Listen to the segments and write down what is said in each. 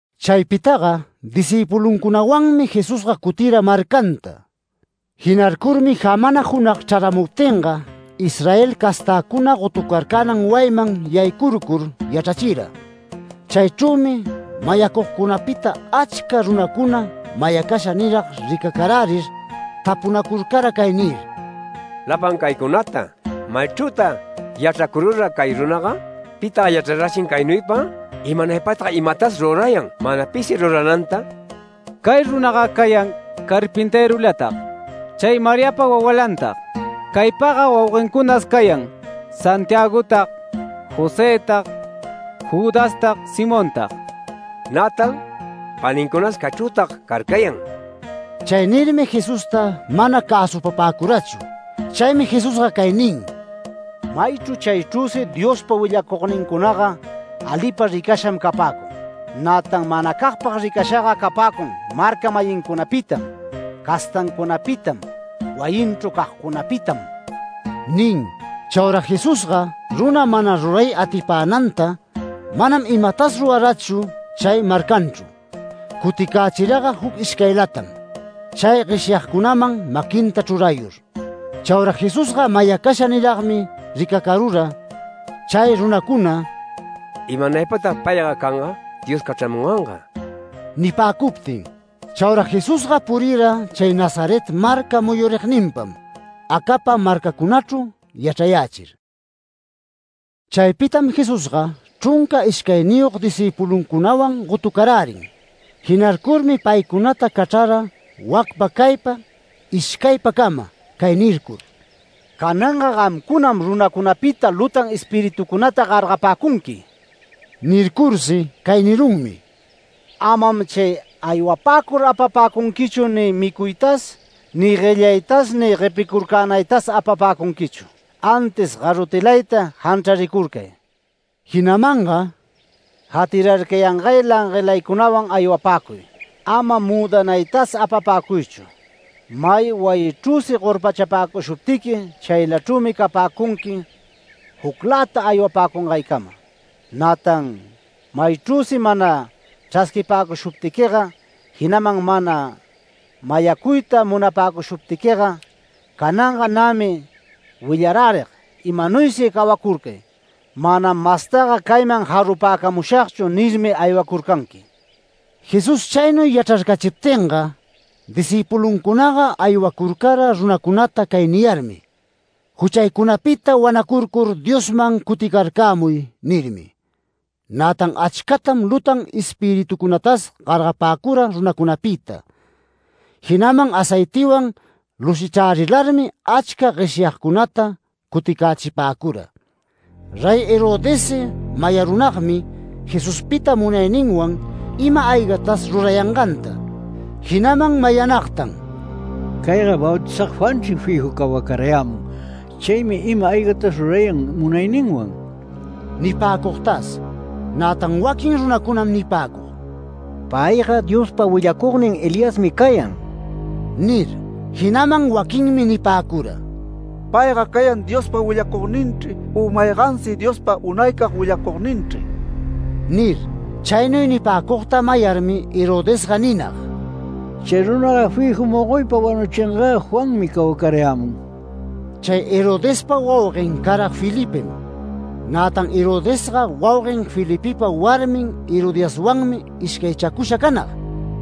Chaypitaga discïpuluncunawanmi Jesusga cutira marcanta. Jinarcurmi jamana junag chraramuptinga Israel castäcuna gotucarcänan wayiman yaycurcur yachrachira. Chaychrümi mayacugcunapita achca runacuna mayacasha nirag ricacarärir tapunacurcara cay nir: “Lapan caycunata ¿maychrütag yachracurura cay runaga? ¿Pitag yachrarachin caynuypa? ¿Imanaypatag imatas rurayan mana pisi rurananta? Cay runaga cayan carpintërulatag, chay Mariapa wawalantag. Caypaga wauguencunas cayan Santiagotag, Josëtag, Judastag, Simontag, nätan panincunas caychrütag carcayan”. Chay nirmi Jesusta mana cäsupapäcurachu. Chaymi Jesusga cay nin: “Maychru chaychrüsi Diospa willacugnincunaga alipag ricasham capäcun. Nätan manacagpag ricashaga capäcun marca-mayincunapitam, castancunapitam, wayinchru cagcunapitam” nin. Chaura Jesusga runa mana ruray atipänanta, manam imatas rurarachu chay marcanchru. Cuticächiraga juc ishcaylatam, chay gueshyagcunaman maquinta chrurayur. Chaura Jesusga mayacasha niragmi ricacarura chay runacuna “¡Imanaypatag payga canga Dios cachramunganga!” nipäcuptin. Chaura Jesusga purira chay Nazaret marca muyurigninpam, acapa marcacunachru yachrayächir. Chaypitam Jesusga chrunca ishcayniyog discïpuluncunawan gotucarärin. Jinarcurmi paycunata cachrara wacpa caypa ishcaypacama, cay nircur: “Cananga gamcunam runacunapita lutan espiritucunata gargapäcunqui”. Nircursi cay nirunmi: “Amam chay aywapäcur apapäcunquichu ni micuytas ni guellaytas ni guepicurcänaytas apapäcunquichu. Antis garrotilayta janchraricurcay”. Jinamanga “Jatirarcayangay languelaycunawan aywapäcuy, ama müdanaytas apapäcuychu. May wayichrüsi gorpachapäcushuptiqui, chaylachrümi capäcunqui jucläta aywapäcungaycama. Nätan maychrüsi mana chrasquipäcushuptiquiga, jinaman mana mayacuyta munapäcushuptiquiga, ‘Cananga nämi willarärig, imanuysi cawacurcay, manam mastaga cayman jarumushagchu’ nirmi aywacurcanqui”. Jesús chaynuy yachrarcachiptinga, discïpuluncunaga aywacurcara runacunata cay niyarmi: “Juchaycunapita wanacurcur Diosman cuticarcämuy” nirmi. Nätan achcatam lutan espiritucunatas gargapäcura runacunapita, jinaman aceitiwan lushichrärilarmi achca gueshyagcunata cuticächipäcura. Rey Herodessi mayarunagmi Jesuspita munayninwan ima-aygatas rurayanganta. Jinaman mayanagta “Cayga Bautizag Juanchri fiju cawacarayämun. Chaymi ima-aygatas rurayan munayninwan” nipäcugtas. Nätan waquin runacunam nipäcug: “Payga Diospa willacugnin Eliasmi cayan” nir. Jinaman waquinmi nipäcura: “Payga cayan Diospa willacugninchri u maygansi Diospa unaycag willacugninchri” nir. Chaynuy nipäcugta mayarmi Herodesga ninag: “Chay runaga fiju mogoypa wanuchingä Juanmi cawacarayämun”. Chay Herodespa wauguen cara Felipem. Nätan Herodesga wauguen Felipepa warmin Herodiaswanmi ishcaychacusha canag.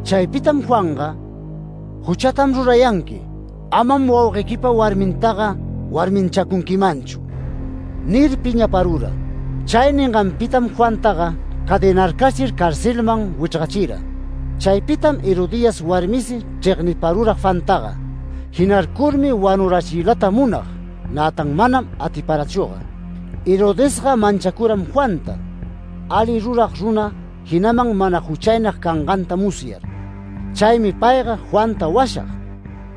Chaypitam Juanga “Juchatam rurayanqui, amam wauguequipa warmintaga warmichacunquimanchu” nir piñaparura. Chay ninganpitam Juantaga cadenarcachir carcelman wichrgachira. Chaypitam Herodías warmisi chregniparura Juantaga. Jinarcurmi wanurachiylata munag, nätan manam atiparachüga. Herodesga manchacuram Juanta, alita rurag runa jinaman mana juchaynag canganta musyar. Chaymi payga Juanta washag.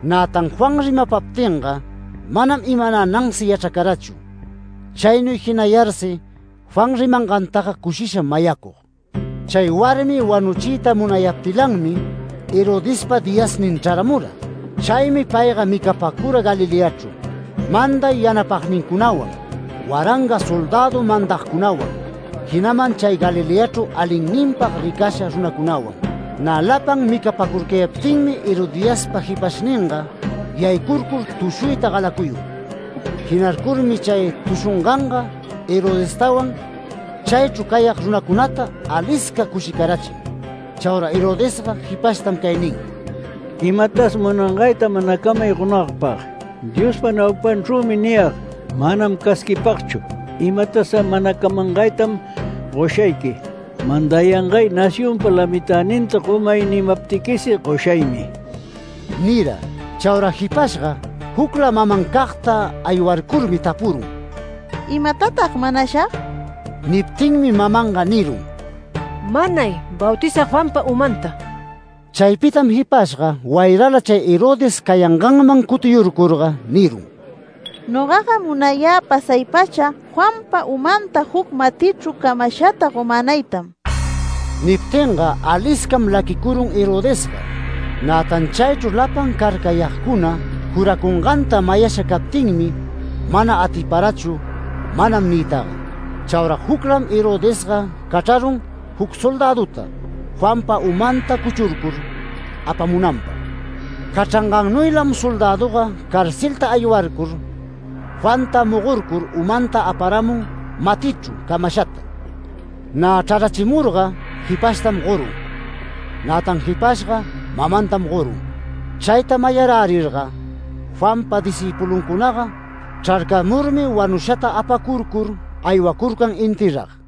Nätan Juan rimapaptinga manam imanänansi yachracarachu. Chaynuy jinayarsi Juan rimangantaga cushisham mayacug. Chay warmi wanuchiyta munayaptilanmi Herodespa diyasnin chraramura. Chaymi payga micapäcura Galileachru, manday yanapagnincunawan, waranga soldädu mandagcunawan, jinaman chay Galileachru alinninpag ricasha runacunawan. Nä lapan micapacurcayaptinmi Herodiaspa jipashninga yaycurcur tushuyta galacuyun. Jinarcurmi chay tushunganga Herodestawan, chaychru cayag runacunataga, alisca cushicarachin. Chaura Herodesga jipashtam cay nin: “Imatas munangayta manacamay gonagpag. Diospa naupanchrümi niyag, manam casquipagchu, imatas manacamangaytam goshayqui. ‘Mandayangay nacionpa lamitäninta gomay’ nimaptiquis goshaymi” nira. Chaura jipashga jucla mamancagta aywarcurmi tapurun: “¿Imatatag manashag?” Niptinmi mamanga nirun: “Manay Bautizag Juanpa umanta”. Chaypitam jipashga wayrala chay Herodes cayanganman cutiyurcurga nirun: “Nogaga munayä pasay-pacha Juanpa umanta juc matichru camashata gomänaytam”. Niptinga aliscam laquicurun Herodesga. Nätan chaychru lapan carcayagcuna juracunganta mayasha captinmi mana atiparachu “Manam” niytaga. Chaura juclam Herodesga cachrarun juc soldäduta Juanpa umanta cuchurcur apamunanpag. Cachrangannuylam soldäduga carcelta aywarcur Juanta mogorcur umanta aparamun matichru camashata. Nä chrarachimurga jipashtam gorun. Nätan jipashga mamantam gorun. Chayta mayarärirga Juanpa discïpuluncunaga, chrarcamurmi wanushata apacurcur aywacurcan enterrag.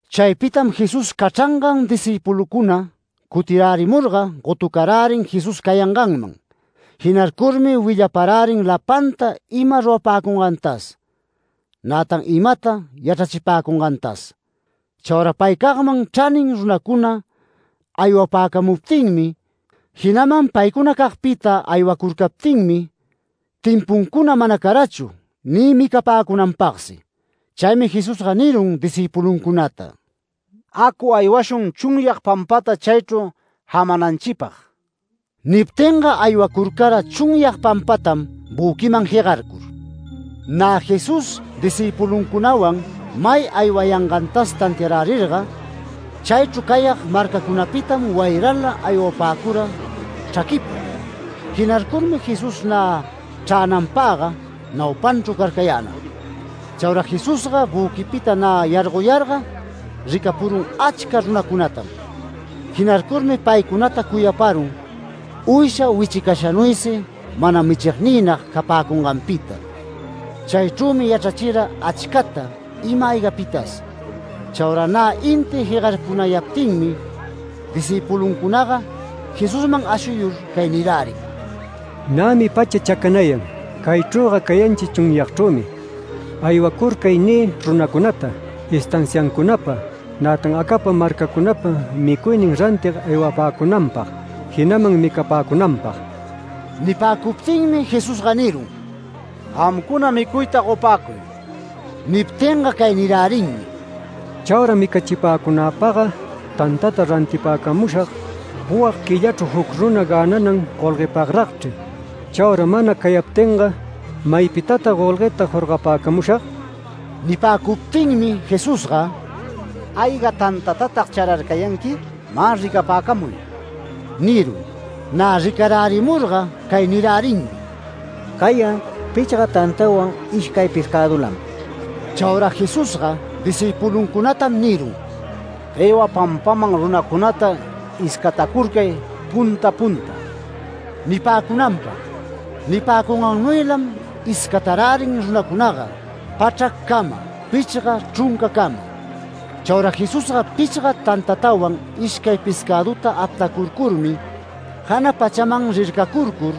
Chaypitam Jesús cachrangan discïpuluncuna cutirärimurga gotucarärin Jesús cayanganman. Jinarcurmi willaparärin lapanta ima rurapäcungantas, nätan imata yachrachipäcungantas. Chaura paycagman chranin runacuna aywapäcamuptinmi, jinaman paycunacagpita aywacurcaptinmi timpuncuna mana carachu ni micapäcunanpagsi. Chaymi Jesusga nirun discïpuluncunata: “Acu aywashun chunyag pampata chaychru jamananchipag”. Niptinga aywacurcara chunyag pampatam büquiman jegarcur. Nä Jesús discïpuluncunawan may aywayangantas tantiarärirga, chaychru cayag marcacunapitam wayrala aywapäcura chraquiypa. Jinarcurmi Jesús nä chränanpagga naupanchru carcayänag. Chaura Jesusga büquipita nä yargoyarga ricapurun achca runacunatam. Jinarcurmi paycunata cuyaparun uysha wichicashanuysi mana michigniynag capäcunganpita. Chaychrümi yachrachira achcata ima-aygapitas. Chaura nä inti jegarpunayaptinmi discïpuluncunaga Jesusman ashuyur cay nirärin: “Nämi pacha chacanayan. Caychrüga cayanchi chunyagchrümi. ‘Aywacurcay’ niy runacunata, estanciacunapa, nätan acapa marcacunapa micuynin rantig aywapäcunanpag jinaman micapäcunanpag”. Nipäcuptinmi Jesusga nirun: “Gamcuna micuyta gopäcuy”. Niptinga cay nirärinmi: “¡Chaura micachipäcunäpagga tantata rantipäcamushag puwag quillachru juc runa gänanan golguepagragchri! Chaura mana cayaptinga ¿maypitatag golgueta jorgapäcamushag?” Nipäcuptinmi Jesusga “¿Ayga tantatatag chararcayanqui? Mä ricapäcamuy” nirun. Nä ricarärimurga cay nirärinmi: “Cayan pichga tantawan ishcay pescädulam”. Chaura Jesusga discïpuluncunatam nirun: “Guewa pampaman runacunata iscatacurcay punta punta” nipäcunanpag. Nipäcungannuylam iscatarärin runacunaga, pachraccama, pichga chruncacama. Chaura Jesusga pichga tantatawan, ishcay pescäduta aptacurcurmi jana pachaman rircacurcur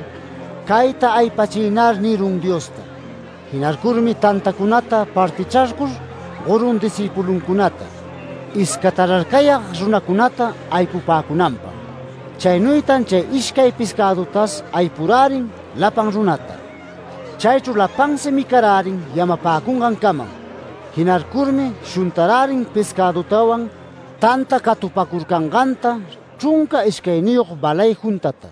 “Cayta aypachinar” nirun Diosta. Jinarcurmi tantacunata partichrarcur gorun discïpuluncunata, iscatararcayag runacunata aypupäcunanpag. Chaynuytan chay ishcay pescädutas aypurärin lapan runata. Chaychru lapansi micarärin yamapäcungancamam. Jinarcurmi shuntarärin pescäduwan, tanta catupacurcanganta, chrunca ishcayniyog balay juntata.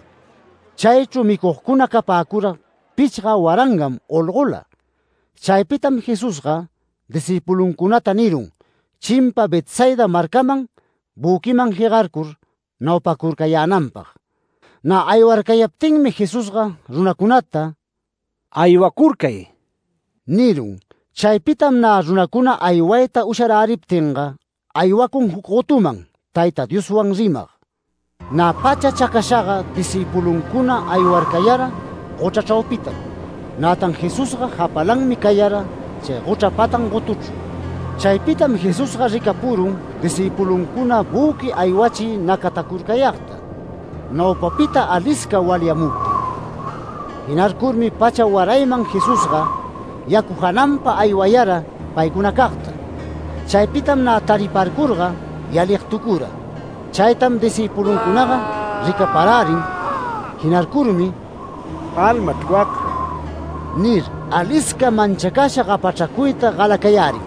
Chaychru micugcuna capäcura pichga warangam olgola. Chaypitam Jesusga discïpuluncunata nirun chimpa Betsaida marcaman büquiman jegarcur naupacurcayänanpag. Nä aywarcayaptinmi Jesusga runacunata “Aywacurcay” nirun. Chaypitam nä runacuna aywayta usharäriptinga aywacun juc gotuman Tayta Dioswan rimag. Nä pacha chacashaga discïpuluncuna aywarcayara gochra chraupitam. Nätan Jesusga japalanmi cayara chay gochra patan gotuchru. Chaypitam Jesusga ricapurun discïpuluncuna büqui aywachiy nacatacurcayagta, naupapita alisca walyamuptin. Jinarcurmi pacha warayman Jesusga yacu jananpa aywayara paycunacagta. Chaypitam nä tariparcurga yaligtucura. Chaytam discïpuluncunaga ricaparärin, jinarcurmi “Almachr wacga” nir, alisca manchacasha gapachracuyta galacayärin.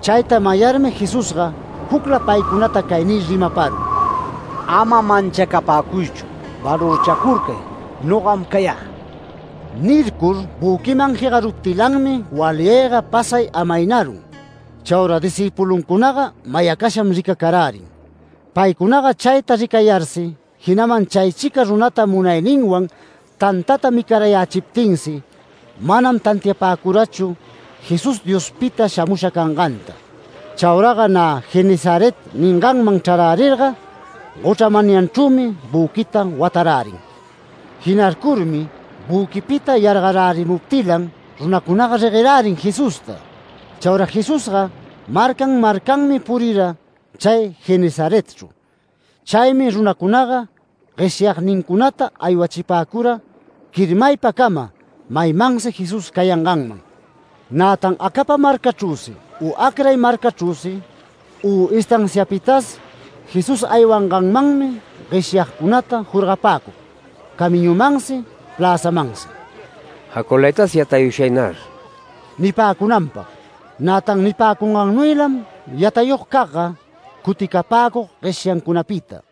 Chayta mayarmi Jesusga jucla paycunata cay nir rimaparun: “¡Ama manchacapäcuychu! Valorchacurcay, nogam cayä”. Nircur büquiman jegaruptilanmi walyayga pasay amaynarun. Chaura discïpuluncunaga mayacasham ricacarärin. Paycunaga chayta ricayarsi, jinaman chaychica runata munayninwan tantata micarayächiptinsi, manam tantiapäcurachu Jesús Diospita shamusha canganta. Chauraga nä Genesaret ninganman chrarärirga gochra manyanchrümi büquita watarärin. Jinarcurmi büquipita yargarärimuptilan runacunaga reguerärin Jesusta. Chaura Jesusga marcan marcanmi purira chay Genesaretchru. Chaymi runacunaga gueshyagnincunata aywachipäcura quirmaypacama maymansi Jesús cayanganman. Nätan acapa marcachrüsi, u acray marcachrüsi, u estanciapitas Jesús aywanganmanmi gueshyagcunata jorgapäcug, camiñumansi pläzamansi “Jaculaytas yatayushagnar” nipäcunanpag. Nätan nipäcungannuylam yatayugcagga cuticapäcug gueshyancunapita.